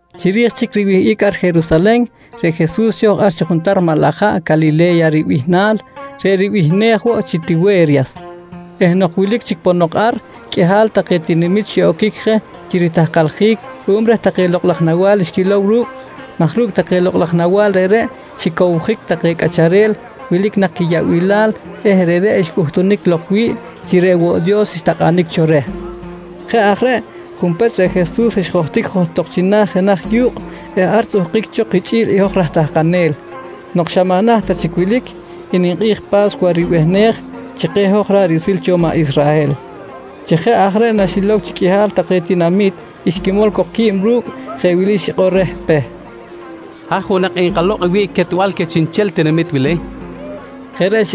Chiri̱j chic riwihꞌic ar Jerusalen reꞌ Jesus xo̱j ar chi juntar maꞌ laj haꞌ Calile̱ya ribihnal, reꞌ ribihnej woꞌ chi Tiwe̱ryas eh nok wilic chic ponok ar, qꞌuihal take tinamit xiꞌoquic je chi ritahkaljic ruꞌum reh take lokꞌ laj nawa̱l xquilow ru̱cꞌ maj ru̱cꞌ take lokꞌ laj nawa̱l reꞌreꞌ xicowjic take cꞌacharel wilic nak quiyaꞌbilal eh reꞌreꞌ xcꞌuhtunic lok wi̱ꞌ chi reꞌ woꞌ Dios xtakꞌanic cho reh. Jeꞌ aj reꞌ, junpech reꞌ Jesus xjohtic johtok china̱ jenaj yu̱kꞌ eh ar xtzꞌuhkic cho kichꞌi̱l i hoj raj tahkanel nok xa maꞌ naht ta chic wilic i ninkꞌi̱j Pa̱scuwa ribihnej chi keh hoj ra̱ꞌ riꞌsil cho maꞌ Israhel. Chi jeꞌ aj reꞌ naxilow chi qꞌuihal take tinamit xquimol cok qui̱b ru̱cꞌ, jeꞌ wili xikꞌor reh Peh: «Haj woꞌ nak enkalokꞌ wiꞌc quetbal queh chiꞌnchel tinamit wili? nqui reh.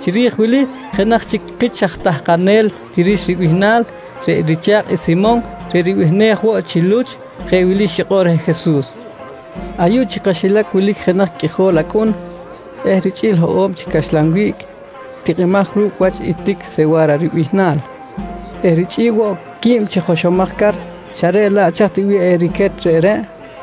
Chiri̱j wili jenaj chic kich aj tahkanel Tirix ribihnal reꞌ richa̱kꞌ i Simon reꞌ ribihnej woꞌ chi Luch, je wili xikꞌor reh Jesus: «Ayuꞌ chi kaxilac wilic jenaj qꞌuijol acꞌun eh richꞌi̱l hoꞌo̱b chi caxlan wiꞌc tikꞌimaj ru̱cꞌ wach i tic sewa̱ra ribihnal eh richꞌi̱l woꞌ quib chi joxomaj car, xa reꞌ laꞌ chaj ti bih eriquet reꞌreꞌ? nqui reh Jesus.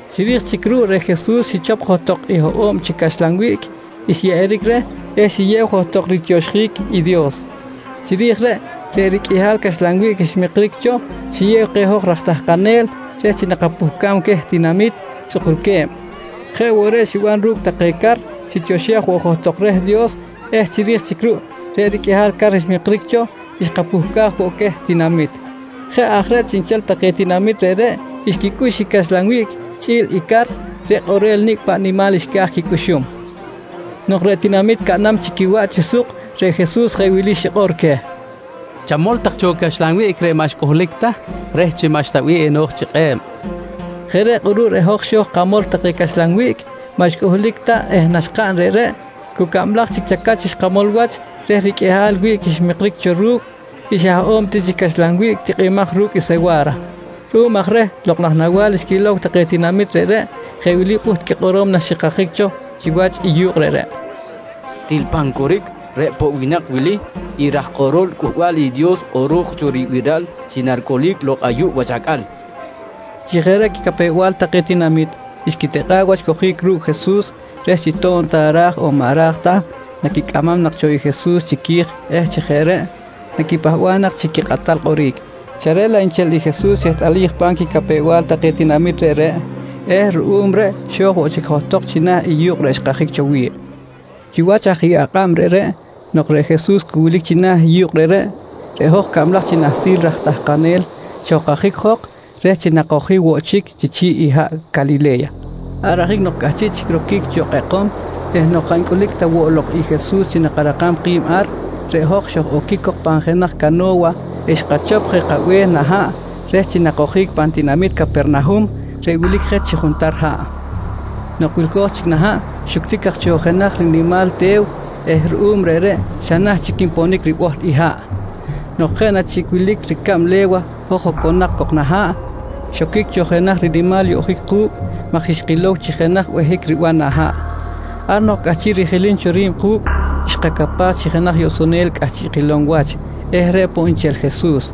Chiri̱j chic ruꞌ reꞌ Jesus xichop johtok i hoꞌo̱b chi caxlan wiꞌc xyeꞌeric reh eh xiyew johtok ritioxjic i Dios. Chiri̱j reꞌ, reꞌ riqꞌuihal caxlan wiꞌc xmikric cho xiyew keh hoj raj tahkanel reh chi nakapuhcam queh tinamit tzꞌukulque̱b. Jeꞌ woꞌ reꞌ xiban ru̱cꞌ take car, xitioxej woꞌ johtok reh Dios eh chiri̱j chic ruꞌ reꞌ riqꞌuihal car xmikric cho xkapuhcaj woꞌ queh tinamit. Jeꞌ aj reꞌ chiꞌnchel take tinamit reꞌreꞌ xquicꞌux i caxlan wiꞌc chꞌi̱l i car reꞌ kꞌorel nicꞌ paꞌ nimal xca̱j quicꞌuxum. Nok reꞌ take tinamit caꞌnam chic quiwaꞌ chi suk, reꞌ Jesus jeꞌ wili xikꞌor keh: «Chamol tak cho i caxlan wiꞌc reꞌ maꞌ xcꞌuhlic ta reh chi maꞌxta bih eno̱j chi kꞌe̱b, nqui keh. Jeꞌ reꞌ kꞌuruꞌ reꞌ hoj xo̱j kamol take caxlan wiꞌc maꞌ xcꞌuhlic ta eh naxkaꞌn reꞌreꞌ, cu cablaj chic chacach xkamol wach reh riqꞌuihal wiꞌc xmikric cho ru̱cꞌ i xa hoꞌo̱b ti chi caxlan wiꞌc tikꞌimaj ru̱cꞌ sewa̱ra. Ruꞌum aj reh lokꞌ laj nawa̱l xquilow take tinamit reꞌreꞌ, jeꞌ wili pꞌuht quikꞌorom naxikajic cho chiwach i yu̱kꞌ reꞌreꞌ: «Til pan coric reꞌ poꞌ winak wili i raj kꞌorol Cꞌuhbal i Dios kꞌoro̱j cho ribiral chi naricꞌulic lok ayuꞌ wach acꞌal, nqui take. Chi jeꞌ reꞌ quicapew-bal take tinamit, xquitikꞌa̱ꞌ wach cojic ru̱cꞌ Jesus reh chi to̱b ta ra̱j on maꞌ ra̱j ta, naquicꞌamam nak cho i Jesus chiqui̱j eh chi jeꞌ reꞌ naquipahba̱ꞌ nak chi quikꞌatal kꞌoric, xa reꞌ laꞌ nchel i Jesus xehtꞌalij pa̱m quicapew-bal take tinamit reꞌreꞌ eh ruꞌum reꞌ xo̱j woꞌ chic johtok china̱ i yu̱kꞌ reꞌ xkajic cho wi̱ꞌ. Chiwach aj i akꞌab reꞌreꞌ nok reꞌ Jesus cu wilic china̱ i yu̱kꞌ reꞌreꞌ, reꞌ hoj cablaj chi nahsil raj tahkanel xojkajic jok reh chi nakojic woꞌ chic chi chi̱ꞌ i haꞌ Calile̱ya. Ar ajic nok cꞌahchiꞌ chic roquic cho kꞌekom eh nok jaꞌ ncꞌulic ta woꞌ lok i Jesus chi nakarakam ki̱b ar, reꞌ hoj xoj-oquic cok pan jenaj cano̱wa eh xkachop je kabe̱h nah haꞌ reh chi nakojic pan tinamit Capernahum reꞌ wilic je chi juntar haꞌ. Nok wilco̱j chic nah haꞌ xuctic aj cho jenaj rinimal te̱w eh ruꞌum reꞌreꞌ xa naht chic nponic ribohl i haꞌ. Nok jeꞌ na chic wilic ricab le̱wa hoj oconak cok nah haꞌ, xoquic cho jenaj rinimal yoꞌjic ku̱cꞌ maj xkilow chi jenaj behic riban nah haꞌ. Ar nok cꞌahchiꞌ rijilim cho ri̱b ku̱cꞌ, xkacapaj chi jenaj yoꞌsonel cꞌahchiꞌ kilom wach eh reꞌ poꞌ nchel i Jesus.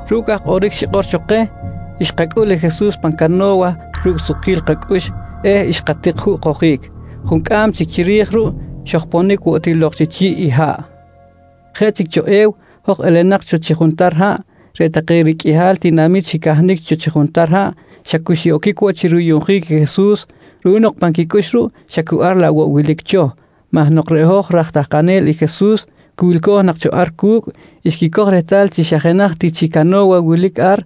Ru̱cꞌ aj kꞌoric xikꞌor cho keh, xkacꞌul i Jesus pan cano̱wa ru̱cꞌ sukquil kacꞌux eh xkatik juꞌ kojic. Juncꞌam chic chiri̱j ruꞌ xojponic woꞌ ti lok chi chi̱ꞌ i haꞌ. Jeꞌ chic cho e̱w hoj elenak cho chi juntar haꞌ, reꞌ take riqꞌuihal tinamit xicahnic cho chi juntar haꞌ xa cu xiꞌoquic woꞌ chi ruyuꞌnjic i Jesus ruꞌum nok pan quicꞌux ruꞌ xa cu ar laꞌ woꞌ wilic cho maj nok reꞌ hoj raj tahkanel i Jesus cu wilco̱j nak cho ar cu̱cꞌ, xquicoj rehtal chi xa jenaj ti chi cano̱wa wilic ar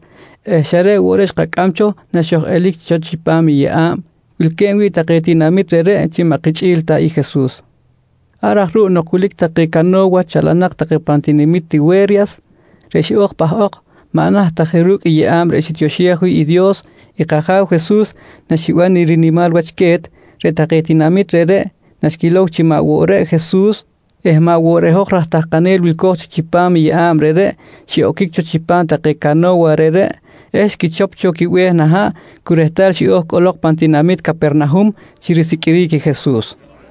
eh xa reꞌ woꞌ reꞌ xkacꞌam cho naxoj-elic cho chipam i yeꞌa̱b wilque̱b wi̱ꞌ take tinamit reꞌreꞌ chi maꞌ kichꞌi̱l ta i Jesus. Ar aj ruꞌ nok wilic take cano̱wa chalanak take pan tinamit Tiwe̱ryas, reꞌ xiꞌo̱j pahꞌok maꞌ naht ta je ru̱cꞌ i yeꞌa̱b reꞌ xitioxej wi̱ꞌ Dios i kAja̱w Jesus naxiban i rinimal wach que̱t, reꞌ take tinamit reꞌreꞌ naxquilow chi maꞌ woꞌ reꞌ Jesus eh maꞌ woꞌ reꞌ hoj raj tahkanel wilco̱j chic chipam i yeꞌa̱b reꞌreꞌ, xiꞌoquic cho chipam take cano̱wa reꞌreꞌ eh xquichop cho quibe̱h nah haꞌ cu rehtal xiꞌo̱j cꞌolok pan tinamit Capernahum chi risiqꞌuiric i Jesus.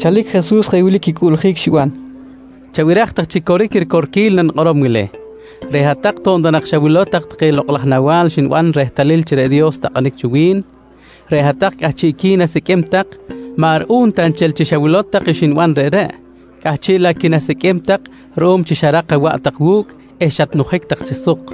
Chalic Jesus jeꞌ wili quicꞌuꞌljic xiban keh: «Chabiraj tak chi coric i ricorquil nanikꞌorom wili: Reꞌ hat-tak to̱b ta xawilow tak take lokꞌ laj nawa̱l xniban rehtalil chi reꞌ Dios xtakꞌanic cho wi̱n, reꞌ hat-tak cꞌahchiꞌqui̱n asiqꞌuim tak maꞌ ruꞌum ta nchel chi xawilow tak xniban reꞌreꞌ, cꞌahchiꞌ laꞌ qui̱nasiqꞌuim tak ruꞌum chi xarak awaꞌ tak wu̱cꞌ eh xatnujic tak chi suk.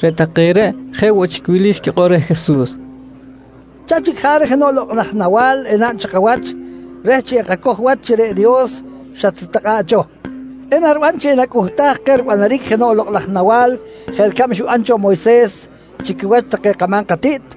Reꞌ take reꞌ jeꞌ woꞌ chic wili xquikꞌor reh Jesus: «Chaj chic jaric jenoꞌ lokꞌ laj nawa̱l enaꞌn chi kawach reh chi enkacoj wach chi reꞌ Dios xatritakꞌa̱ꞌ cho? Enariban chi enacꞌuhtaj keh ribanaric jenoꞌ lokꞌ laj nawa̱l jeꞌ ricab xiban cho Moyses chi quiwach take kama̱m katiꞌt?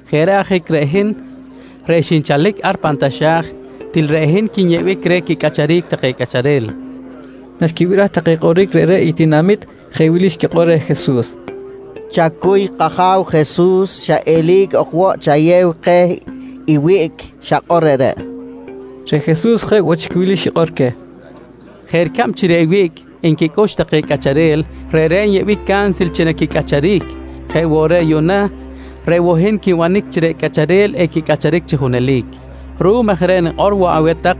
Jeꞌ reꞌ ajic reꞌ hin reꞌ xinchalic ar pan taxa̱j, til reꞌ hin quinyeꞌbic reh quicꞌacharic take cꞌacharel, nqui Jesus. Naxquibiraj take kꞌoric reꞌreꞌ i tinamit, jeꞌ wili xquikꞌor reh Jesus: «Chacuy kAja̱w Jesus, xa eli̱c ok chayew keh i wiꞌc xakꞌor reꞌreꞌ, nqui take reh. Reꞌ Jesus jeꞌ woꞌ chic wili xikꞌor queh: «Jeꞌ ricab chi reꞌ wiꞌc nquicꞌux take cꞌacharel, reꞌreꞌ nyeꞌbic cansil chi naquicꞌacharic jeꞌ woꞌ reꞌ yuꞌna reꞌ woꞌ hin quinbanic chi reꞌ cꞌacharel equicꞌacharic chi junelic. Ruꞌum aj reꞌ nikꞌor woꞌ aweh tak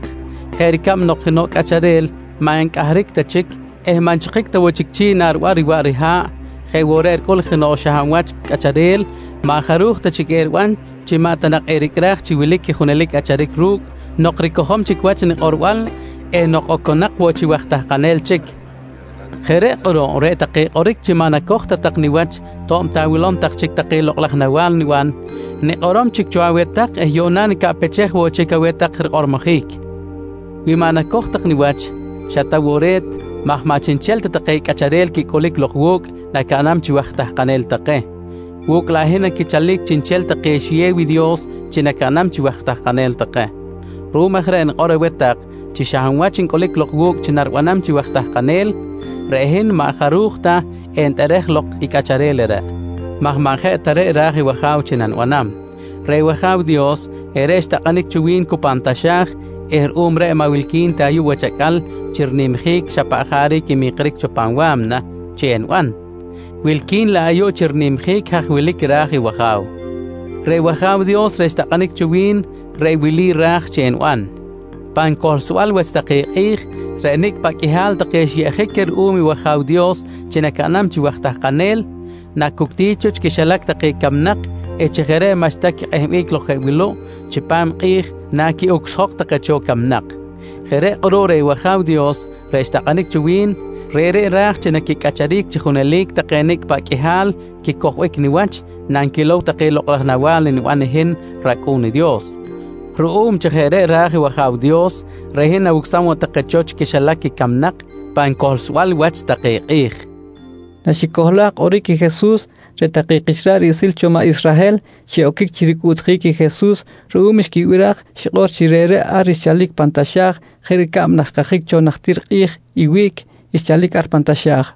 jeꞌ ricab nok jenoꞌ cꞌacharel maꞌ ncꞌahric ta chic eh maꞌ nchikic ta woꞌ chic chi̱ꞌ nariban riwaꞌ riha̱ꞌ, jeꞌ woꞌ reꞌ ricꞌul jenoꞌ xa hab wach cꞌacharel maꞌ jaruj ta chic eriban chi maꞌ ta nak ericꞌraj chi wilic i junelic cꞌacharic ru̱cꞌ nok ricojom chic wach nikꞌorbal eh nok oconak woꞌ chi waj tahkanel chic. «Jeꞌ reꞌ kꞌuruꞌ reꞌ take kꞌoric chi maꞌ nacoj ta tak niwach to̱b ta awilom tak chic take lokꞌ laj nawa̱l niban, nikꞌorom chic cho aweh tak eh yuꞌna nicaꞌpechej woꞌ chic aweh tak rikꞌormojic. Wi maꞌ nacoj tak niwach, xa ta woꞌ re̱t maj maꞌ chiꞌnchel ta take cꞌacharel quicꞌulic lok wu̱cꞌ nacaꞌnam chi waj tahkanel take. Wu̱cꞌ laꞌ hin naquichalic chiꞌnchel take xiyew i Dios chi nacaꞌnam chi waj tahkanel take. Ruꞌum aj reꞌ nikꞌor aweh tak chi xa hab wach ncꞌulic lok wu̱cꞌ chi naribanam chi waj tahkanel, reꞌ hin maꞌ jaruj ta enitꞌerej lok i cꞌacharel reꞌreꞌ, maj maꞌ jeꞌ ta reꞌ ra̱j i wAja̱w chi nanibanam. «Reꞌ wAja̱w Dios, reꞌreꞌ xtakꞌanic cho wi̱n cu pan taxa̱j eh ruꞌum reꞌ maꞌ wilqui̱n ta ayuꞌ wach acꞌal chi rinimjic i xa paꞌ jaric nmikric cho pan wa̱mna chi eniban, wilqui̱n laꞌ ayuꞌ chi rinimjic haj wilic ra̱j i wAja̱w. Reꞌ wAja̱w Dios reꞌ xtakꞌanic cho wi̱n, reꞌ wili ra̱j chi eniban: Pan cohlsbal wach take kꞌi̱j, reꞌ nicꞌ paꞌ qꞌuihal take xyeꞌjic queh ruꞌum i wAja̱w Dios chi nacaꞌnam chi waj tahkanel, nacuctic cho chi quixilac take camnak eh chi jeꞌ reꞌ maꞌxta quikꞌehbic lok jeꞌ wuluꞌ chipam i kꞌi̱j naquiꞌucsjok take cho camnak. Jeꞌ reꞌ kꞌuruꞌ reꞌ wAja̱w Dios reꞌ xtakꞌanic cho wi̱n, reꞌreꞌ ra̱j chi naquicꞌacharic chi junelic take nicꞌ paꞌ qꞌuihal quicojbic niwach nanquilow take lokꞌ laj nawa̱l niban i hin rAcꞌu̱n i Dios. Ruꞌum chi jeꞌ reꞌ ra̱j i wAja̱w Dios, reꞌ hin nawucsam woꞌ take cho chi quixilac camnak pan cohlsbal wach take kꞌi̱j, nqui Jesus queh i tinamit. Naxicohlaj kꞌoric i Jesus, reꞌ take kich ra̱ꞌ riꞌsil cho maꞌ Israhel xiꞌoquic chi ricꞌuꞌtjic i Jesus ruꞌum xquibiraj xikꞌor chi reꞌreꞌ ar xchalic pan taxa̱j jeꞌ ricab naxkajic cho najtir kꞌi̱j i wiꞌc xchalic ar pan taxa̱j.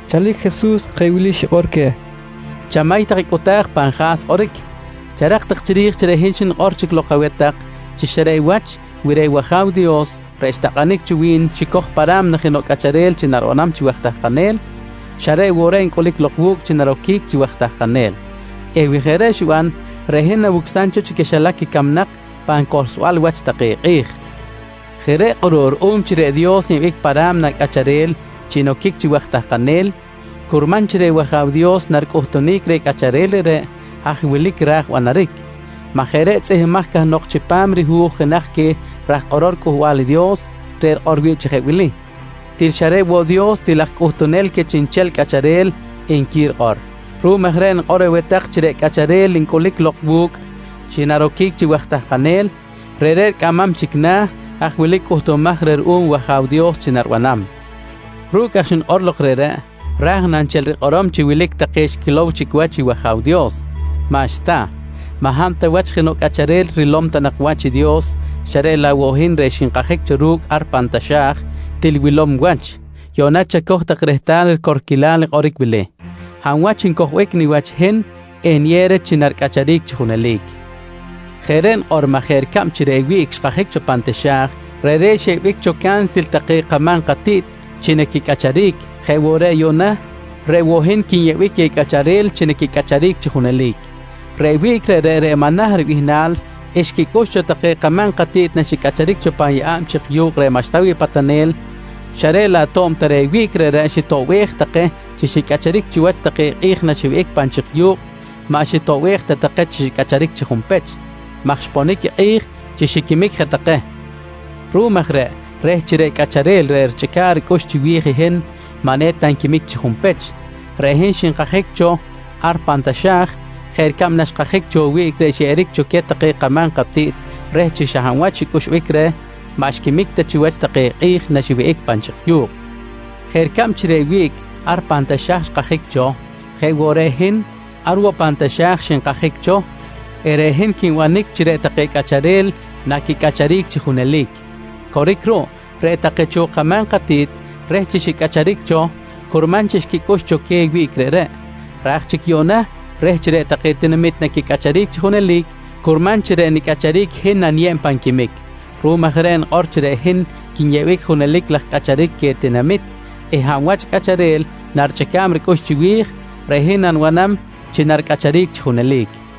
Chalic Jesus jeꞌ wili xikꞌor queh: «Chamay tak i cꞌuta̱j pan ja̱s kꞌoric. Charak tak chiri̱j reꞌ hin xnikꞌor chic lok aweh tak chi xa reꞌ wach wi reꞌ wAja̱w Dios reꞌ xtakꞌanic cho wi̱n xicoj pa ra̱mna jenoꞌ cꞌacharel chi naribanam chi waj tahkanel, xa reꞌ woꞌ reꞌ ncꞌulic lok wu̱cꞌ chi naroquic chi waj tahkanel eh wi jeꞌ reꞌ xiban reꞌ hin nawucsam cho chi quixilac camnak pan cohlsbal wach take kꞌi̱j. Jeꞌ reꞌ kꞌuruꞌ ruꞌum chi reꞌ Dios nyeꞌbic pa ra̱mna cꞌacharel chi noquic chi waj tahkanel, curman chi reꞌ wAja̱w Dios naricꞌuhtunic reh cꞌacharel reꞌreꞌ haj wilic i ra̱j banaric, maj jeꞌ reꞌ tzꞌihmbimaj cahnok chipam rihu̱j jenaj queh raj kꞌorol Cꞌuhbal i Dios reꞌ rikꞌor wi̱ꞌ chi jeꞌ wili: “Til xa reꞌ woꞌ Dios til aj cꞌuhtunel queh chiꞌnchel cꞌacharel, nqui rikꞌor. «Ruꞌum aj reꞌ nikꞌor aweh tak chi reꞌ cꞌacharel ncꞌulic lok wu̱cꞌ chi naroquic chi waj tahkanel, reꞌreꞌ ricꞌamam chic na̱ i haj wilic cꞌuhtumaj reh ruꞌum i wAja̱w Dios chi naribanam. Ru̱cꞌ aj xnikꞌor lok reꞌreꞌ, raj na nchel rikꞌorom chi wilic take xquilow chic wach i wAja̱w Dios? Maꞌxta, maꞌ hab ta wach jenoꞌ cꞌacharel rilom ta nak wach i Dios xa reꞌ laꞌ woꞌ i hin reꞌ xinkajic cho ru̱cꞌ ar pan taxa̱j til wilom wach. «Yuꞌna chacoj tak rehtal i ricorquilal kꞌoric wili: Hab wach ncojbic niwach i hin, eniyew reh chi naricꞌacharic chi junelic. Jeꞌ reꞌ nikꞌor maj jeꞌ ricab chi reꞌ wiꞌc xkajic cho pan taxa̱j, reꞌreꞌ xyeꞌbic cho cansil take kama̱m katiꞌt chi naquicꞌacharic jeꞌ woꞌ reꞌ yuꞌna reꞌ woꞌ hin quinyeꞌbic queh cꞌacharel chi quicꞌacharic chi junelic. «Reꞌ wiꞌc reꞌreꞌ, reꞌ “Manah” ribihnal, xquicꞌux cho take kama̱m katiꞌt naxicꞌacharic cho pan yeꞌa̱b chik yu̱kꞌ reꞌ maꞌxta wi̱ꞌ patanel, xa reꞌ laꞌ to̱b ta reꞌ wiꞌc reꞌreꞌ xitoꞌbej take chi xicꞌacharic chiwach take kꞌi̱j naxiwihꞌic pan chik yu̱kꞌ, maꞌ xitoꞌbej ta take chi xicꞌacharic chi junpech maj xponic i kꞌi̱j chi xiquimic je take. Ruꞌum aj reꞌ reh chi reꞌ cꞌacharel reꞌ richꞌica̱ꞌ ricꞌux chiwi̱j i hin maꞌ eta nquimic chi junpech, reꞌ hin xinkajic cho ar pan taxa̱j jeꞌ ricab naxkajic cho i wiꞌc xyeꞌeric cho queh take kama̱m katiꞌt reh chi xa hab wach xcꞌuxbic reh, maꞌ xquimic ta chiwach take kꞌi̱j naxiwihꞌic pan chik yu̱kꞌ. «Jeꞌ ricab chi reꞌ wiꞌc ar pan taxa̱j xkajic cho, jeꞌ woꞌ reꞌ i hin ar woꞌ pan taxa̱j xinkajic cho eh reꞌ hin quinbanic chi reꞌ take cꞌacharel naquicꞌacharic chi junelic. Coric ruꞌ, reꞌ take cho kama̱m katiꞌt reh chi xicꞌacharic cho curman chi xquicꞌux cho queh i wiꞌc reꞌreꞌ. Raj chic yuꞌna reh chi reꞌ take tinamit naquicꞌacharic chi junelic, curman chi reꞌ nicꞌacharic i hin naniyeb pan quimic. Ruꞌum aj reꞌ nikꞌor chi reꞌ hin quinyeꞌbic junelic laj cꞌacharic queh tinamit eh hab wach cꞌacharel narichꞌica̱b ricꞌux chiwi̱j reꞌ hin nanibanam chi naricꞌacharic chi junelic, nqui Jesus.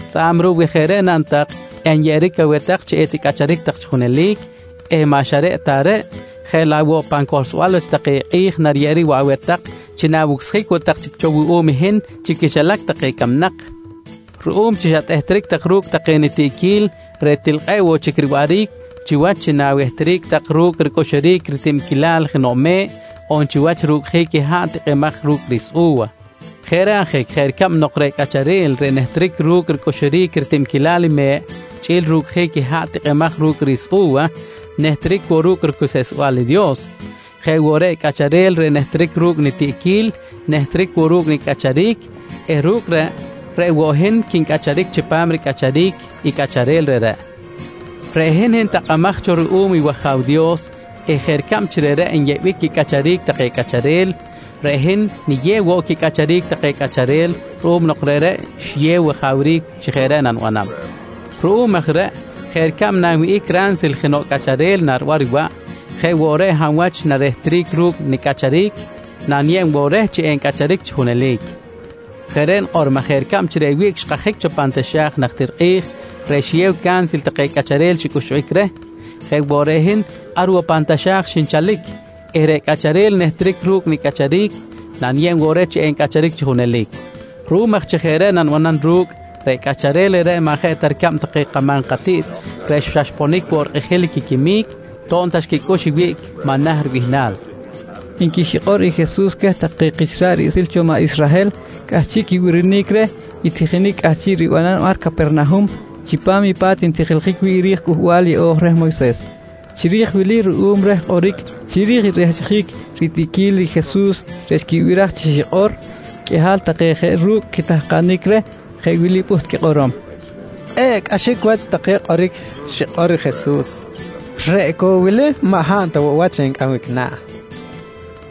Tzꞌa̱b ruꞌ, wi jeꞌ reꞌ naꞌn tak enyeꞌeric aweh tak chi eticꞌacharic tak chi junelic eh maꞌ xa reꞌ ta reꞌ, jeꞌ laꞌ woꞌ pan cohlsbal wach take kꞌi̱j nariyeꞌeric woꞌ aweh tak chi na̱wucsjic woꞌ tak chic cho wuꞌum i hin chi quixilac take camnak ruꞌum chi xatehtric tak ru̱cꞌ take nitiꞌquil reꞌ til kꞌe̱ꞌ woꞌ chic riwaꞌric chiwach chi na wehtric tak ru̱cꞌ ricꞌuxuric ritibquilal jenoꞌ me̱ꞌ on chiwach rucꞌjic i haꞌ tikꞌimaj ru̱cꞌ i ri̱s u̱wa. Jeꞌ reꞌ ajic jeꞌ ricab nok reꞌ cꞌacharel reꞌ nehtric ru̱cꞌ ricꞌuxuric ritibquilal i me̱ꞌ chꞌi̱l rucꞌjic i haꞌ tikꞌimaj ru̱cꞌ i ri̱s u̱wa nehtric woꞌ ru̱cꞌ ricuseꞌsbal i Dios, jeꞌ woꞌ reꞌ i cꞌacharel reꞌ nehtric ru̱cꞌ nitiꞌquil nehtric woꞌ ru̱cꞌ nicꞌacharic eh ru̱cꞌ reꞌ, reꞌ woꞌ hin quincꞌacharic chipam ricꞌacharic i cꞌacharel reꞌreꞌ. «Reꞌ hin, hin takꞌamaj cho ruꞌum i wAja̱w Dios eh jeꞌ ricab chi reꞌreꞌ nyeꞌbic quicꞌacharic take cꞌacharel, reꞌ hin niyew woꞌ quicꞌacharic take cꞌacharel ruꞌum nok reꞌreꞌ xiyew wajawric chi jeꞌ reꞌ nanibanam. Ruꞌum aj reꞌ jeꞌ ricab nanwihꞌic ransil jenoꞌ cꞌacharel nariban riwaꞌ, jeꞌ woꞌ reꞌ i hab wach narehtric ru̱cꞌ nicꞌacharic, naniyeb woꞌ reh chi encꞌacharic chi junelic. Jeꞌ reꞌ nikꞌor maj jeꞌ ricab chi reꞌ wiꞌc xkajic cho pan taxa̱j najtir kꞌi̱j reꞌ xiyew cansil take cꞌacharel xicꞌuxbic reh, jeꞌ woꞌ reꞌ hin ar woꞌ pan taxa̱j xinchalic eh reꞌ cꞌacharel nehtric ru̱cꞌ nicꞌacharic, naniyeb woꞌ reh chi encꞌacharic chi junelic. Ruꞌum aj chi jeꞌ reꞌ nanibanam ru̱cꞌ, reꞌ cꞌacharel reꞌreꞌ maꞌ jeꞌ ta ricab take kama̱m katiꞌt reꞌ xa xponic woꞌ rikꞌijil quiquimic to̱b ta xquicꞌux i wiꞌc “Manah” ribihnal, nqui xikꞌor i Jesus queh take kich ra̱ꞌ riꞌsil cho maꞌ Israhel cꞌahchiꞌ quibirinic reh i tijinic cꞌahchiꞌ ribanam ar Capernahum chipam i pa̱t ntijiljic wi̱ꞌ ri̱j Cꞌuhbal Yeꞌo̱j reh Moyses. Chiri̱j wili ruꞌum reh kꞌoric chiri̱j i rehchjic ritiꞌquil i Jesus reꞌ xquibiraj chi xikꞌor, qꞌuihal take je ru̱cꞌ quitahkanic reh jeꞌ wili pꞌuht quikꞌorom: «Kꞌe̱ꞌ cꞌaxic wach take kꞌoric xikꞌor i Jesus, reꞌ cok wili maꞌ hab ta woꞌ wach encꞌambic na̱?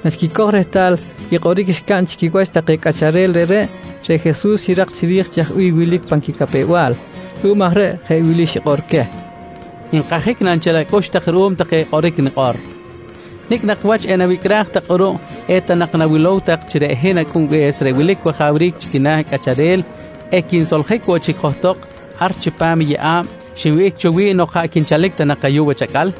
nqui take chi quiwach. Naxicoj rehtal i kꞌoric xcaꞌn chi quiwach take cꞌacharel reꞌreꞌ, reꞌ Jesus xirak chiri̱j chaj bih wilic pan quicapew-bal. Ruꞌum aj reꞌ jeꞌ wili xikꞌor queh: «Nkajic na nchel acꞌux tak ruꞌum take kꞌoric xnikꞌor? Nicꞌ nak wach enawicꞌraj tak kꞌuruꞌ eta nak nawilow tak chi reꞌ hin Acꞌunbe̱s reꞌ wilic wajawric chi quina̱ cꞌacharel, equinsoljic woꞌ chic johtok ar chipam yeꞌa̱b xinwihꞌic cho wi̱ꞌ nok jaꞌ quinchalic ta nak ayuꞌ wach acꞌal?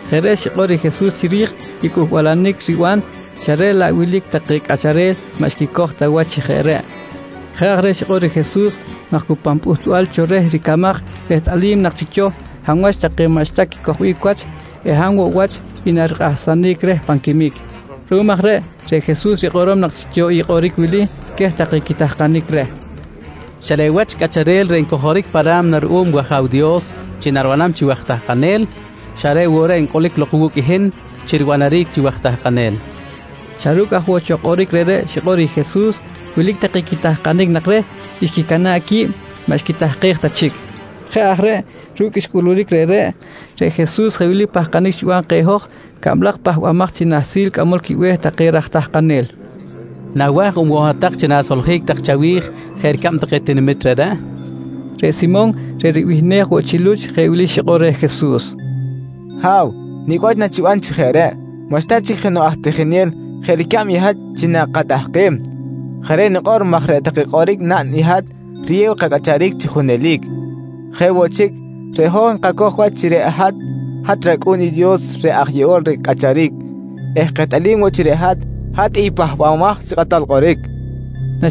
Jeꞌ reꞌ xikꞌor i Jesus chiri̱j i cꞌuhbalanic riban xa reꞌ laꞌ wilic take cꞌacharel maꞌ xicojbic ta wach chi jeꞌ reꞌ. Jeꞌ aj reꞌ xikꞌor i Jesus maj cu pan pꞌuhtbal cho reh ricamaj rehtꞌalim nak chic cho hab wach take maꞌxta quicojbic wach eh hab woꞌ wach i narikꞌahsanic reh pan quimic. Ruꞌum aj reꞌ, reꞌ Jesus rikꞌorom nak chic cho i kꞌoric wili queh take quitahkanic reh: «Xa reꞌ wach i cꞌacharel reꞌ ncojoric pa ra̱mna ruꞌum wAja̱w Dios chi naribanam chi waj tahkanel, xa reꞌ woꞌ reꞌ ncꞌulic lok wu̱cꞌ hin chi ribanaric chi waj tahkanel, nqui rikꞌorom cho. Xa ru̱cꞌ aj woꞌ cho kꞌoric reꞌreꞌ xikꞌor i Jesus, wilic take quitahkanic nak reh xquicana̱ꞌ qui̱b, maꞌ xquitahkej ta chic. Jeꞌ aj reꞌ ru̱cꞌ xcꞌuluric reꞌreꞌ, reꞌ Jesus jeꞌ wili pahkanic xiban keh hoj cablaj pahbamaj chi nahsil cꞌamol quibe̱h take raj tahkanel: «Nawa̱j on woꞌ hat-tak chi na̱soljic tak chawi̱j jeꞌ ricab take tinamit reꞌreꞌ? nqui keh. Reꞌ Simon, reꞌ ribihnej woꞌ chi Luch jeꞌ wili xikꞌor reh Jesus: «Ha̱w, nicꞌ wach nachiban chi jeꞌ reꞌ. Maꞌxta chic jenoꞌ aj tijinel jeꞌ ricab i hat chi nakatahkem. Jeꞌ reꞌ nikꞌor maj reꞌ take kꞌoric naꞌn i hat riyew kacꞌacharic chi junelic. Jeꞌ woꞌ chic, reꞌ hoj nkacoj wach chi reꞌ hat, hat rAcꞌu̱n i Dios reꞌ aj yeꞌol reh cꞌacharic eh kehtꞌalim woꞌ chi reꞌ hat, hat i Pahbamaj chi Kꞌatal Kꞌoric, nqui reh.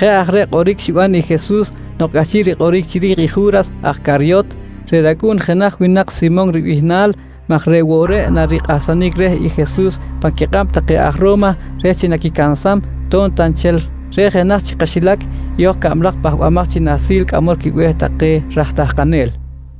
Jeꞌ aj reꞌ kꞌoric xiban i Jesus nok cꞌahchiꞌ rikꞌoric chiri̱j i Ju̱ras aj Caryot, reꞌ racꞌu̱n jenaj winak Simon ribihnal maj reꞌ woꞌ reꞌ narikꞌahsanic reh i Jesus pan quikꞌab take aj Ro̱ma reh chi naquicansam to̱b ta nchel reꞌ jenaj chi kaxilac i hoj cablaj pahbamaj chi nahsil cꞌamol quibe̱h take raj tahkanel.